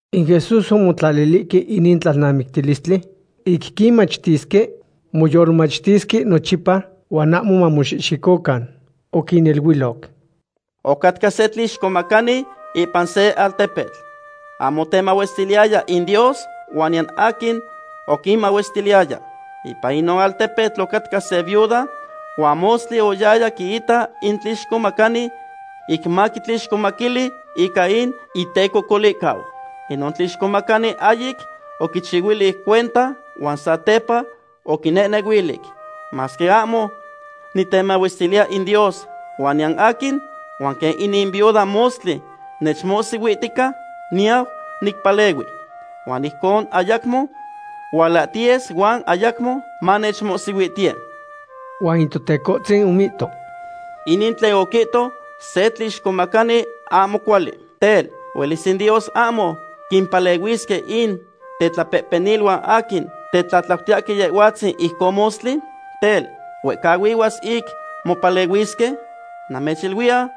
In Jesús omotlalilihque inin tlalnamictilistli ic quinmachtisque moyolmachtisque nochipa huan ahmo mamoxihxicocan. Oquiniluiloc: ―Ocatca se tlixcomacani ipan se altepetl. Ahmo otemahuestiliyaya in Dios huan niyan aquin oquinmahuestiliyaya. Ipan inon altepetl ocatca se viuda huan mostli oyaya quiita in tlixcomacani ic maquitlixcomaquili ica in itecocolihcau. Inon tlixcomacani ahyic oquichihuilic cuenta huan satepa oquinehnehuilic: “Masque ahmo nitemahuestiliya in Dios huan niyan aquin, huan quen inin viuda mostli nechmohsihuihtica, niyau nicpalehui. Huan ijcon ayacmo hualahtiyes huan ayacmo manechmohsihuihtiye.” Huan in Totecohtzin omihto: ―Inin tlen oquihto se tlixcomacani ahmo cuali. Tel, ¿huelis in Dios ahmo quimpalehuisque in tetlapehpeniluan aquin tetlatlautiyahque Yehhuatzin ijcon mostli? Tel, ¿huehcahuihuas ic mopalehuisque? Namechiluiya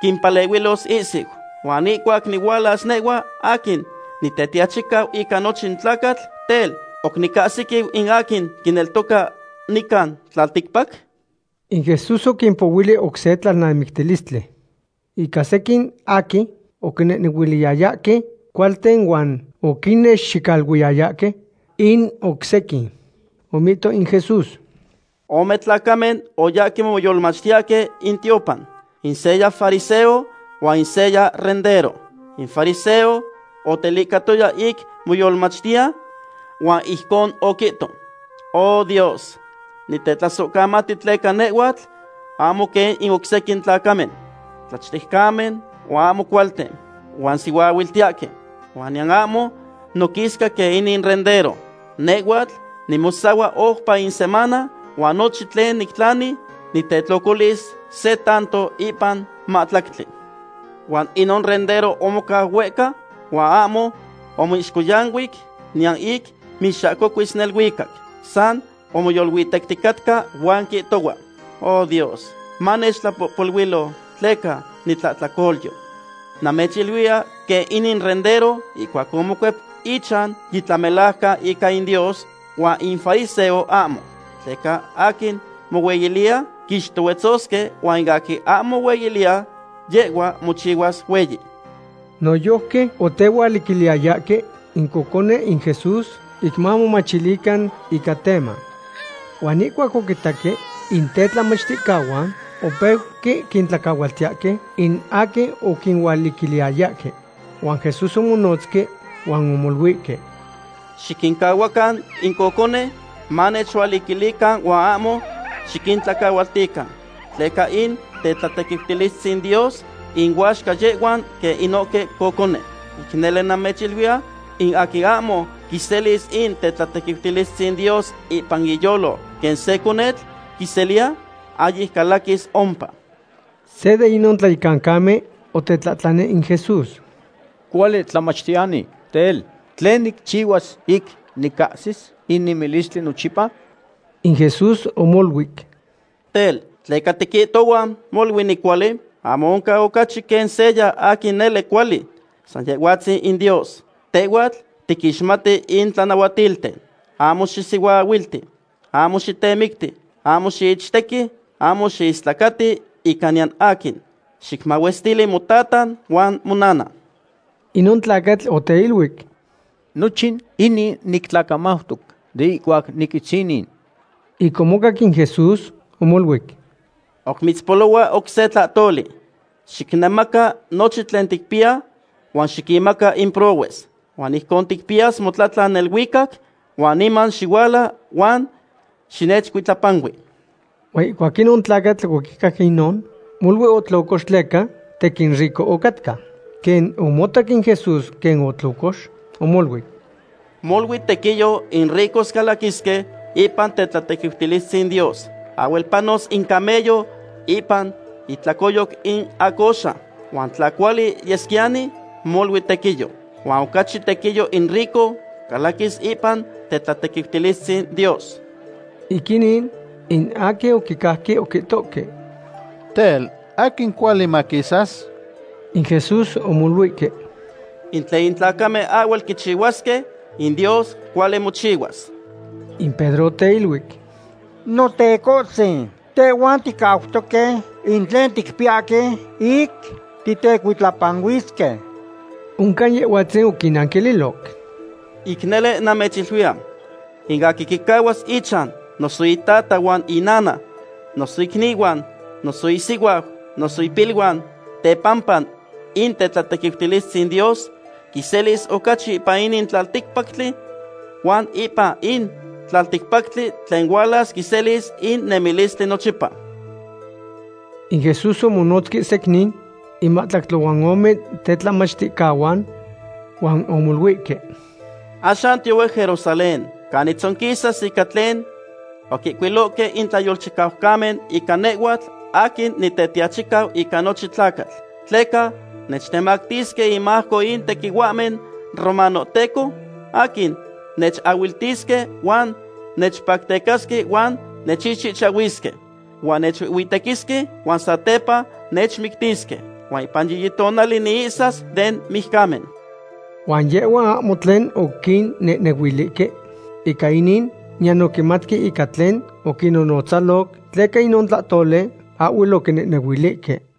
quimpalehuilos ihsiu. Huan ihcuac nihualas nehhua aquin Nitetiachicau ica nochin tlacatl, tel, ¿oc nicahsiquiu in aquin quineltoca nican tlalticpac? In Jesús oquimpohuili oc se tlalnamictilistli ica sequin aquin oquinehnehuiliyayahque cualten huan oquinnexicaluiyayahque in oc sequin. Omihto in Jesús: ―Ome tlacamen oyahque moyolmachtiyahque in tiopan. In seya fariseo huan in seya rendero. In fariseo otelicahtoya ic moyolmachtiya huan ijcon oquihto: “Oh Dios, nitetlasohcamati tleca nehhuatl ahmo quen in oc sequin tlacamen, tlachtejcamen, huan ahmo cualten, huan sihuaahuiltiyahque. Huan niyan ahmo noquisca quen inin rendero. Nehhuatl nimosahua oupa in semana huan nochin tlen nictlani, nitetlocolis se tanto ipan mahtlactli.” Huan inon rendero omocau huehca huan ahmo omixcohyanui niyan ic mixahcocuis neluicac. San omoyoluitecticatca huan quihtohua: “¡O Dios, manechtlapohpoluilo tleca nitlahtlacolyo!” Namechiluiya quen inin rendero ihcuac omocuep ichan yitlamelajcan ica in Dios, huan in fariseo ahmo. Tleca in aquin mohueyiliya quixtohuetzosque, huan in aquin ahmo mohueyiliya, yehhua mochihuas hueyi. Noyojqui otehualiquiliyayahque in cocone in Jesús ic mamomachilican ica teman. Huan ihcuac oquitaque in tetlamachticahuan, opeuque quintlacahualtiyahque in aquin oquinualiquiliyayahque. Huan Jesús omonotzque huan omoluihque: ―Xiquincahuacan in cocone manechualiquilican huan ahmo xiquintlacahualtican, tleca in tetlatequiutilistzin Dios inuaxca yehhuan quen inohque cocone. Ic nele namechiluiya, in aquin ahmo quiseliya in tetlatequiutilistzin Dios ipan iyolo quen se conetl quiseliya, ahyic calaquis ompa. Se de inon tlayecancamen otetlahtlani in Jesús: ―Cuali tlamachtiyani, tel, ¿tlen nicchihuas ic nicahsis in nemilistli nochipa? In Jesús omoluic: ―Tel, ¿tleca tiquihtohua molui nicuali? Ahmo oncan ocachi quen seya aquin nele cuali. San Yehhuatzin in Dios. Tehhuatl tiquixmati in tlanahuatilten: “Ahmo xisihuaahuilti; ahmo xitemicti; ahmo xiichtequi; ahmo xiistlacati ica niyan aquin; xicmahuestili motata huan monana.” Inon tlacatl oteiluic: ―Nochin inin nitlacamautoc de ihcuac niquitzinin. Ic omocac in Jesús, omoluic: ―Oc mitzpolohua oc se tlahtoli. Xicnemaca nochin tlen ticpiya huan xiquinmaca in prohues. Huan ijcon ticpiyas motlatlan neluicac, huan niman xihuala huan xinechcuitlapanui. Huan ihcuac inon tlacatl oquicac inon, molui otlocox tleca tequin rico ocatca. Quen omotac in Jesús quen otlocox, omoluic: ―Molui tequiyo in ricos calaquisque ipan tetlatequiutilistzin Dios. Ahhuel panos in camello ipan itlacoyoc in acoxa. Huan tla cuali yesquiyani, molui tequiyo. Huan ocachi tequiyo in rico calaquis ipan tetlatequiutilistzin Dios. Ic inin, in aquin oquicajque oquihtohque: ―Tel, ¿aquin cuali maquisas? In Jesús omoluihque: ―In tlen in tlacamen ahhuel quichihuasque, in Dios cuali mochihuas. In Pedro oteiluic: ―Notecohtzin, tehhuan ticautoque in tlen ticpiyahque ic titecuitlapanuisque. Oncan Yehhuatzin oquinnanquililoc: ―Ic nele namechiluiya; in aquin quicahuas ichan, noso itata huan inana, noso icnihuan, noso isihuau, noso ipiluan, tepampa in tetlatequiutilistzin Dios, quiselis ocachi ipan inin tlalticpactli, huan ipan in tlalticpactli tlen hualas quiselis in nemilistli nochipa. In Jesús omonotzque secnin in mahtlactli huan ome tetlamachticahuan huan omoluihque: ―Axan tiyohue Jerusalén canin tzonquisas ica tlen oquihcuilohque in tlayolchicaucamen ica nehhuatl aquin Nitetiachicau ica nochin tlacatl. Tleca nechtemactisque inmajco in tequihuahmen romanohteco aquin nechahuiltisque, huan nechpactecasque huan nechixchihchahuisque. Huan nechuihhuitequisque, huan satepa nechmictisque. Huan ipan yiyi tonali niihsas den mijcamen. Huan yehhuan ahmo tlen oquinnehnehuilihque ica inin, niyan oquimatque ica tlen oquinnonotzaloc, tleca inon tlahtoli ahhuel oquinehnehuilihque.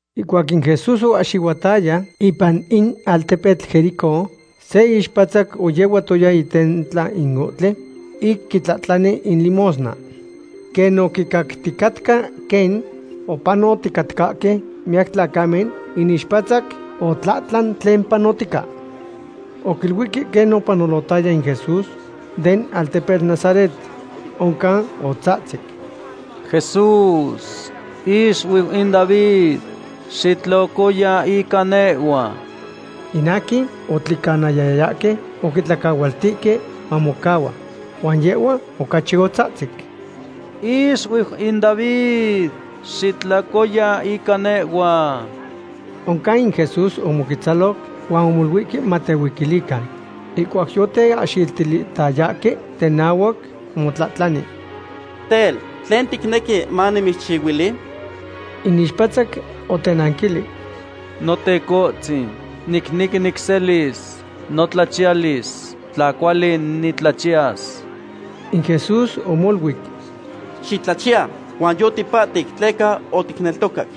Ihcuac in Jesús oahxihuataya ipan in altepetl Jericó, se ixpatzac oyehuatoya itentla in ohtli ic quitlahtlani in limosna. Quen oquicacticatca quen opanoticatcahque miyac tlacamen, in ixpatzac otlahtlan tlen panotica. Oquiluihque quen opanolotaya in Jesús den altepetl Nazaret. Oncan otzahtzic: ―¡Jesús, ixuiu in David, xitlocoya ica nehhua! In aquin otlicanayayahque oquitlacahualtihque mamocahua. Huan yehhua ocachi otzahtzic: ―¡Ixuiu in David, xitlocoya ica nehhua! Oncan in Jesús omoquetzaloc huan omoluihque matehuiquilican. Ihcuac yoteahxiltilihtayahque tenahuac, omotlahtlani: ―Tel, ¿tlen ticnequi manimitzchihuili? In ixpatzac otenanquilic: ―Notecotzin, nicnequi nicselis notlachiyalis, tla cuali nitlachiyas. In Jesús omoluic: ―¡Xitlachiya! Huan yotipahtic tleca oticneltocac.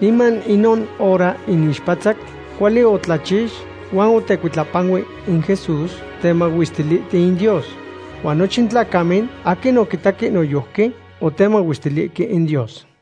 Niman inon hora in ixpatzac cuali otlachix huan otecuitlapanui in Jesús temahuestilihtiu in Dios. Huan nochin tlacamen aquin oquitaque noyojqui otemahuestilihque in Dios.